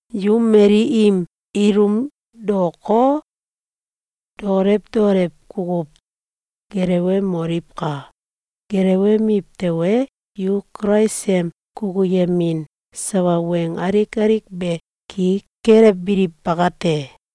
Yu mali im ilum daoko, dokolew dokolew kukuw gelewemoliwka! Gelewemiw tewe, yu Kulais em kukuyemin sawa weng alik alik be ki kelebiliw bakate!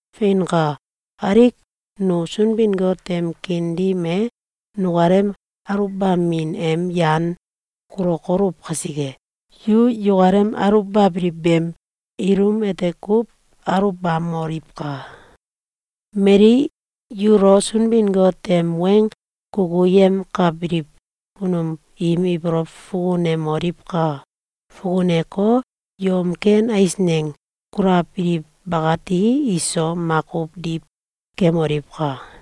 Feinka! Alik nu Sunbin-Got em kiin dim e nukalem aluwbamin em yan kulokoluw kasike, yu yukalem aluwbabiliw beem ilum ete kuw aluwbamoliwka! Mali yulo Sunbin-Got em weng kukuyemkabiliw kunum biim ibolow fukunemoliwka! Fukuneko, yom ken eisneng kulabiliw bakati iso makuw diw kemoliwka!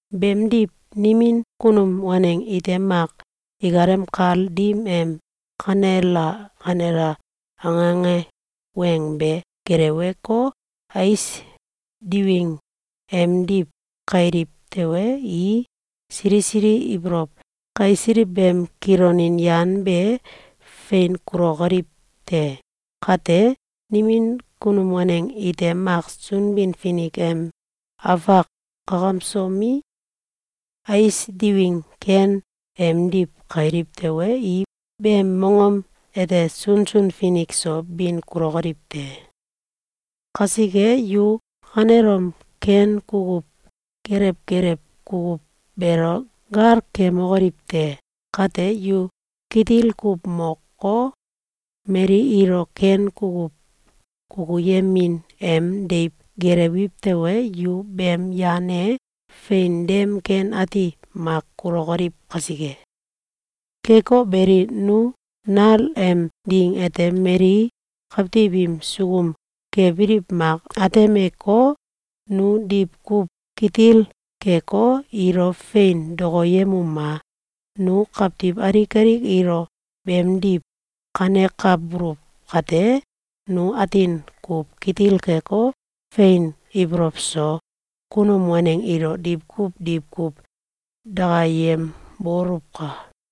Beemdiw, nimin kunum waneng ite mak ikalem kal dim em “Kanela! Kanela!”, ange ange weng be geleweko, ais diwing emdiw kailiw tewe, i sili sili ibolow kaisiliw beem kilonin yan be fein kulokoliw te. Kate, nimin kunum waneng ite mak Sunbin-Finik em afak kakamsomi, ais diwing ken emdiw kailiw tewe, i beem mongom ete sunsun finik so bin kulokoliw te. Kasike, yu kanelom ken kukuw kelew kelew kukuw beelo gal kemokoliw te! Kate, yu kitil kuw moko, mali ilo ken kukuw kukuyemin em deiw gelewiw tewe, yu beem yan e fein dem ken ati mak kulokoliw kasike. Keko beli, nu nal em ding ete mali kawtiw im sukum kebiliw mak atemeko, nu diwkuw kitil keko, ilo fein dokoyemuma! Nu kawtiw alik alik ilo beemdiw kanekabululw kate, nu atin kuw kitil keko, fein ibolow so kunum waneng ilo diwkuw diwkuw dakayemboluwka!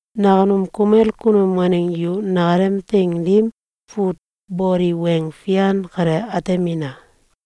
Nakunum kumel kunum waneng yu nakalem teing dim fut boli weng fian kale atemina!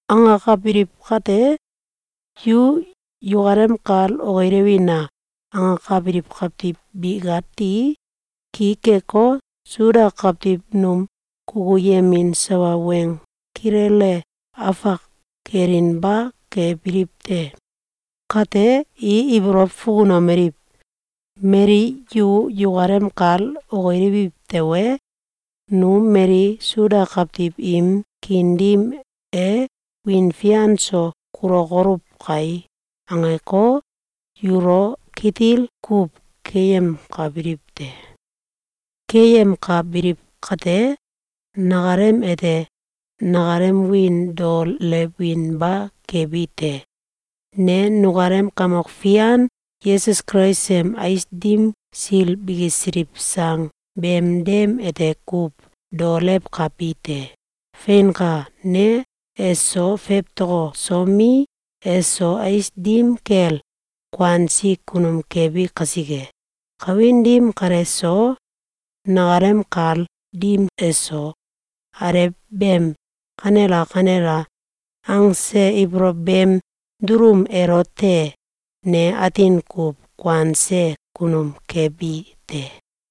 Angakabiliw kate, “Yu yukalem kal okilewina!”, angakabiliw kawtiw bikati ki keko, Suda kawtiw num kukuyemin sawa weng kilele afak kelinba kebiliw te. Kate, i ibolow fukunomeliw: “Mali yu yukalem kal okilewiw tewe, nu mali Suda kawtiw im kiin dim e wiin fian so kulokoluw kai!”, angeko, yulo kitil kuw keyemkabiliw te. Keyemkabiliw kate, nakalem ete nakalem wiin daolewinba kebi te. Ne nukalem Kamok Fian Yesus Kulais em ais dim sil bikisiliw sang beem dem ete kuw daolewkabi te. Feinka! Ne eso fewtokosomi, eso ais dim kel kuansi kunum kebi kasike, kawin dim kale so, nakalem kal dim eso, alew beem “Kanela! Kanela!”, angse ibolow beem dulum elote ne atin kuw kuanse kunum kebi te.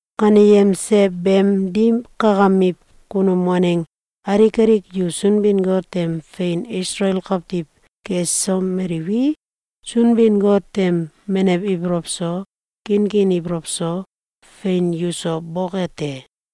Kaneyemse beem dim kakamiw kunum waneng alik alik yu Sunbin-Got em fein Isalael kawtiw kesomeliwi, Sunbin-Got em menew ibolow so, kinkin ibolow so, fein yuso boke te!